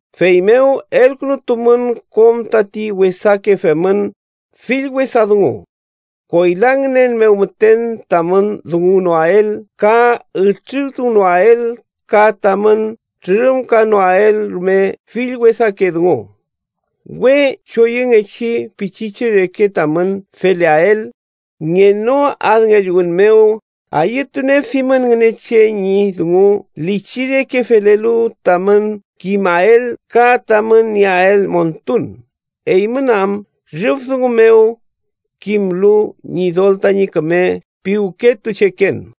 Feymew, elkünutumün kom tati wesake femün, fill wesa dungu, koyla ngünen mew müten tamün dunguwnoael ka ütriruwnoael, ka tamün trürümkanoael rume fill wesake dungu. We choyüngechi pichiche reke tamün feleael, ngenoadngelluwün mew ayütunieafimün Ngünechen ñi dungu lichi reke felelu, tamün kimael ka tamün nieael montun, eymün am rüf dungu mew kimlu Ñidol tañi küme piwketucheken.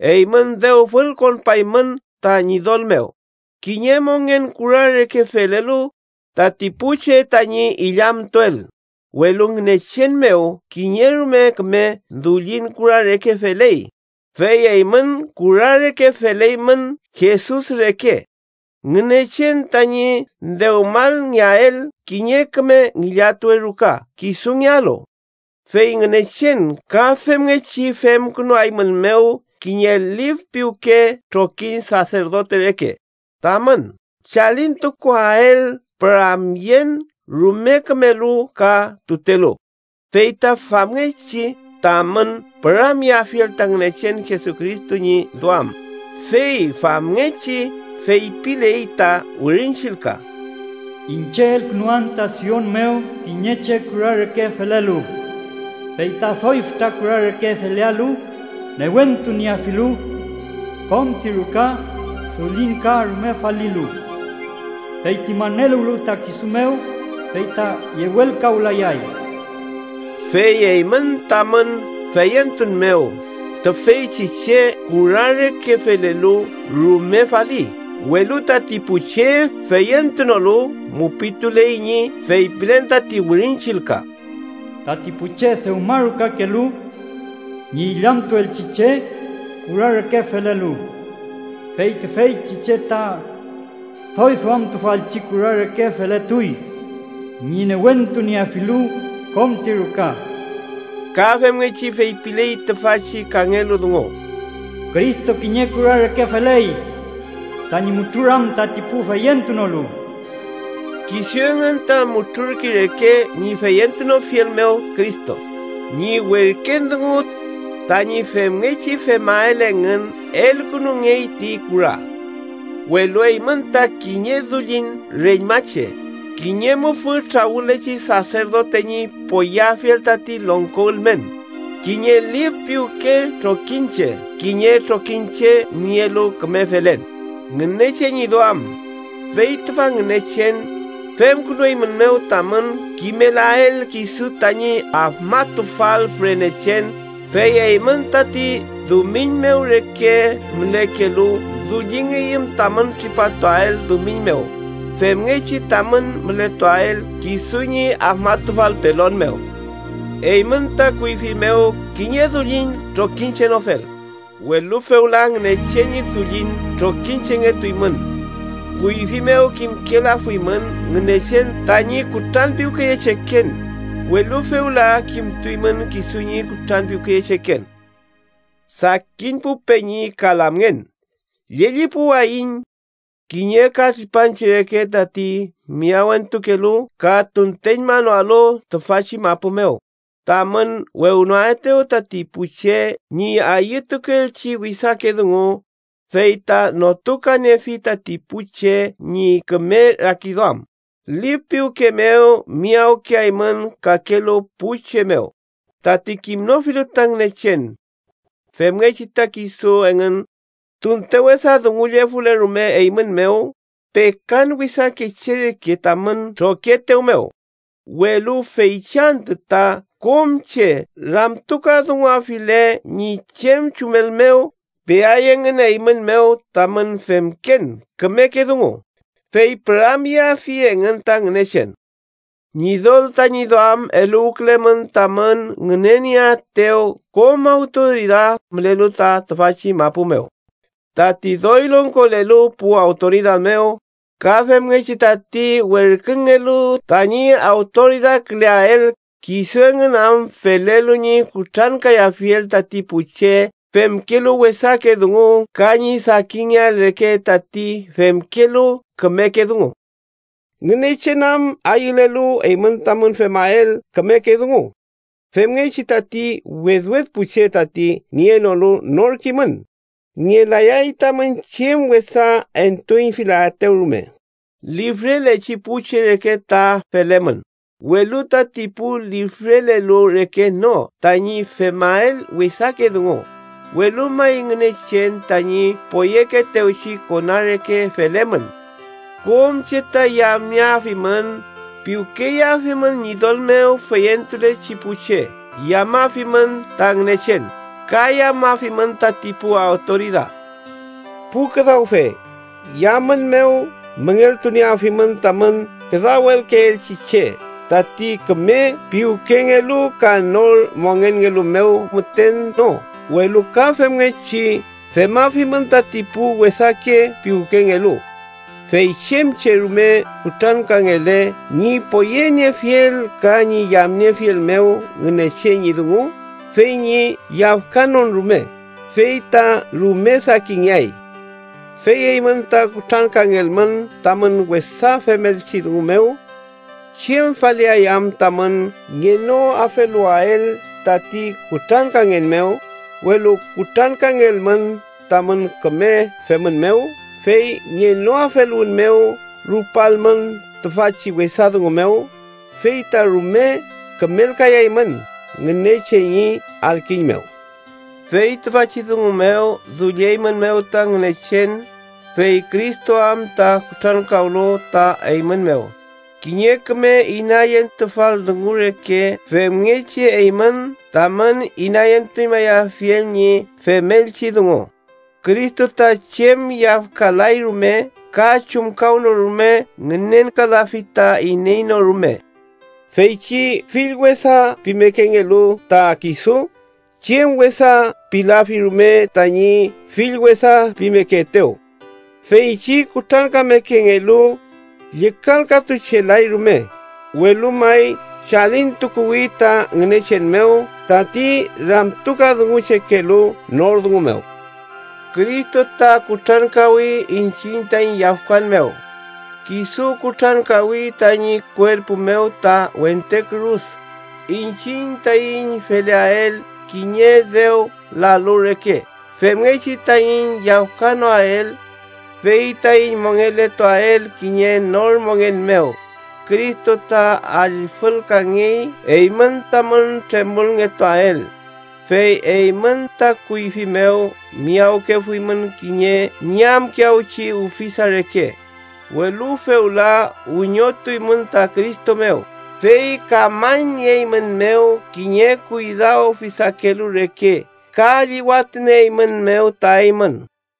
Eymün dew fülkonpaymün ta Ñidol mew, kiñe mongen kura reke felelu, tati pu che tañi illamtuel, welu Ngünechen mew kiñe rume küme dullin kura reke feley. Fey eymün kura reke feleymün Jesus reke, Ngünechen tañi dewmalngeael kiñe küme ngillatuwe ruka kisungealu. Fey Ngünechen ka femngechi femkünuaeymünmew kiñe lif piwke trokiñ saserdote reke, tamün chalintukuael püramyen rume kümelu ka tutelu, fey ta famngechi tamün püramyeafiel ta Ngünechen Jesucristo ñi duam. Fey famngechi feypiley ta Wirin Chillka: “Iñche elkünuan ta Sion mew kiñe che kura reke felelu, fey ta doy fütra kura reke felealu newentunieafilu kom ti ruka, dullin ka rume falilu. Feyti maneluwlu ta kisu mew, fey ta yewelkawlayay.” Fey eymün, tamün feyentun mew, tüfeychi che kura reke felelu rume faliy, welu tati pu che feyentunolu mupituley ñi feypilen tati Wirin Chillka: “Tati pu che dewmarukakelu ñi illamtuelchi che kura reke felelu, fey tüfeychi che ta doy duamtufalchi kura reke feletuy ñi newentunieafilu kom ti ruka.” Ka femngechi feypiley tüfachi kangelu dungu: “Cristo kiñe kura reke feley tañi mutruram tati pu feyentunolu.” Kisu engün ta mutrurkey reke ñi feyentunofiel mew Cristo ñi werken dungu. Tañi femngechi femael engün elkünungey ti kura. Welu eymün ta kiñe dullin reñmache, kiñe mufü trawülechi saserdote ñi poyeafiel tati longko ülmen, kiñe lif piwke trokiñche, kiñe trokiñche nielu küme felen Ngünechen ñi duam. Fey tüfa Ngünechen femkünueymünmew tamün kimelael kisu tañi afmatufal fürenechen, fey eymün tati dumiñ mew reke mülekelu dullingeymün tamün tripatuael dumiñ mew femngechi tamün mületuael kisu ñi afmatufal pelon mew. Eymün ta kuyfi mew kiñe dullin trokiñchenofel, welu fewla Ngünechen ñi dullin trokiñchengetuymün. Kuyfi mew kimkelafuymün Ngünechen tañi kutranpiwkeyecheken, welu fewla kimtuymün kisu ñi kutranpiwkeyecheken. Sakin pu peñi ka lamngen, llellipuwayiñ, kiñe ka tripanche reke tati miyawentukelu ka tunteñmanoalu tüfachi mapu mew, tamün wewnoaetew tati pu che ñi ayütukeelchi wesake dungu, fey ta notukaniefi tati pu che ñi küme rakiduam. Lif piwke mew miyawkeaymün kakelu pu che mew, tati kimnofilu ta Ngünechen. Femngechi ta kisu engün, tunte wesa dungullefule rume eymün mew, pekan wesake che reke tamün trokietew mew, welu feychi antü ta kom che ramtukadunguafile ñi chem chumel mew, peay engün eymün mew tamün femken kümeke dungu, fey püramyeafi engün ta Ngünechen. Ñidol tañi duam eluwkülemün tamün ngünenieaetew kom awtoridad mülelu ta tüfachi mapu mew. Tati doy longkolelu pu awtoridad mew, ka femngechi tati werküngelu tañi awtoridadküleael, kisu engün am felelu ñi kutrankayafiel tati pu che femkelu wesake dungu ka ñi sakingeael reke tati femkelu kümeke dungu. Ngünechen am ayülelu eymün tamün femael kümeke dungu, femngechi tati wedwed pu che tati nienolu nor kimün, ngelayay tamün chem wesa entuüñfilaetew rume. Lifrelechi pu che reke ta felemün, welu tati pu lifrelelu reke no tañi femael wesake dungu, welu may Ngünechen tañi poyekeetewchi kona reke felemün. Kom che ta yamnieafimün. Piwkeyeafimün Ñidol mew feyentulechi pu che, yamafimün ta Ngünechen, ka yamafimün tati pu awtoridad. Pu küdawfe, yamün mew müngeltunieafimün tamün küdawelkeelchi che, tati küme piwkengelu ka nor mongenngelu mew müten no, welu ka femngechi femafimün tati pu wesake piwkengelu. Fey chem che rume kutrankangele ñi poyeniefiel ka ñi yamniefiel mew Ngünechen ñi dungu fey ñi yafkanon rume, fey ta rume sakinngeay. Fey eymün ta kutrankangelmün tamün wesa femelchi dungu mew, ¿chem faliay am tamün ngenoafeluwael tati kutrankangen mew? Welu kutrankangelmün tamün küme femün mew, fey ngenoafeluwün mew rupalmün tüfachi wesa dungu mew, fey ta rume kümelkayaymün Ngünechen ñi adkiñ mew. Fey tüfachi dungu mew dullieymünmew ta Ngünechen, fey Cristo am ta kutrankawlu ta eymün mew, kiñe küme inayentufal dungu reke femngechi eymün tamün inayentuñmayafiel ñi femelchi dungu. “Cristo ta chem yafkalay rume ka chumkawnorume ngünenkalafi ta iney no rume.” Feychi fill wesa pimekengelu ta kisu, chem wesa pilafi rume tañi fill wesa pimekeetew. Feychi kutrankamekengelu, llükalkatuchelay rume, welu may chalintukuwi ta Ngünechen mew, tati ramtukadunguchekelu nor dungu mew. Cristo ta kutrankawi iñchiñ taiñ yafkan mew. Kisu kutrankawi tañi kuerpu mew ta wente kürus, iñchiñ taiñ feleael kiñe dew lalu reke femngechi taiñ yafkawenoael, fey taiñ mongeletuael kiñe nor mongen mew. Cristo ta allfülkangey eymün tamün tremolngetuael. Fey eymün ta kuyfi mew miyawkefuymün kiñe ñamkiyawchi ufisa reke, welu fewla wiñotuymün ta Cristo mew, fey kamañnieeymünmew kiñe kuydaufisakelu reke ka llüwatunieeymünmew ta eymün.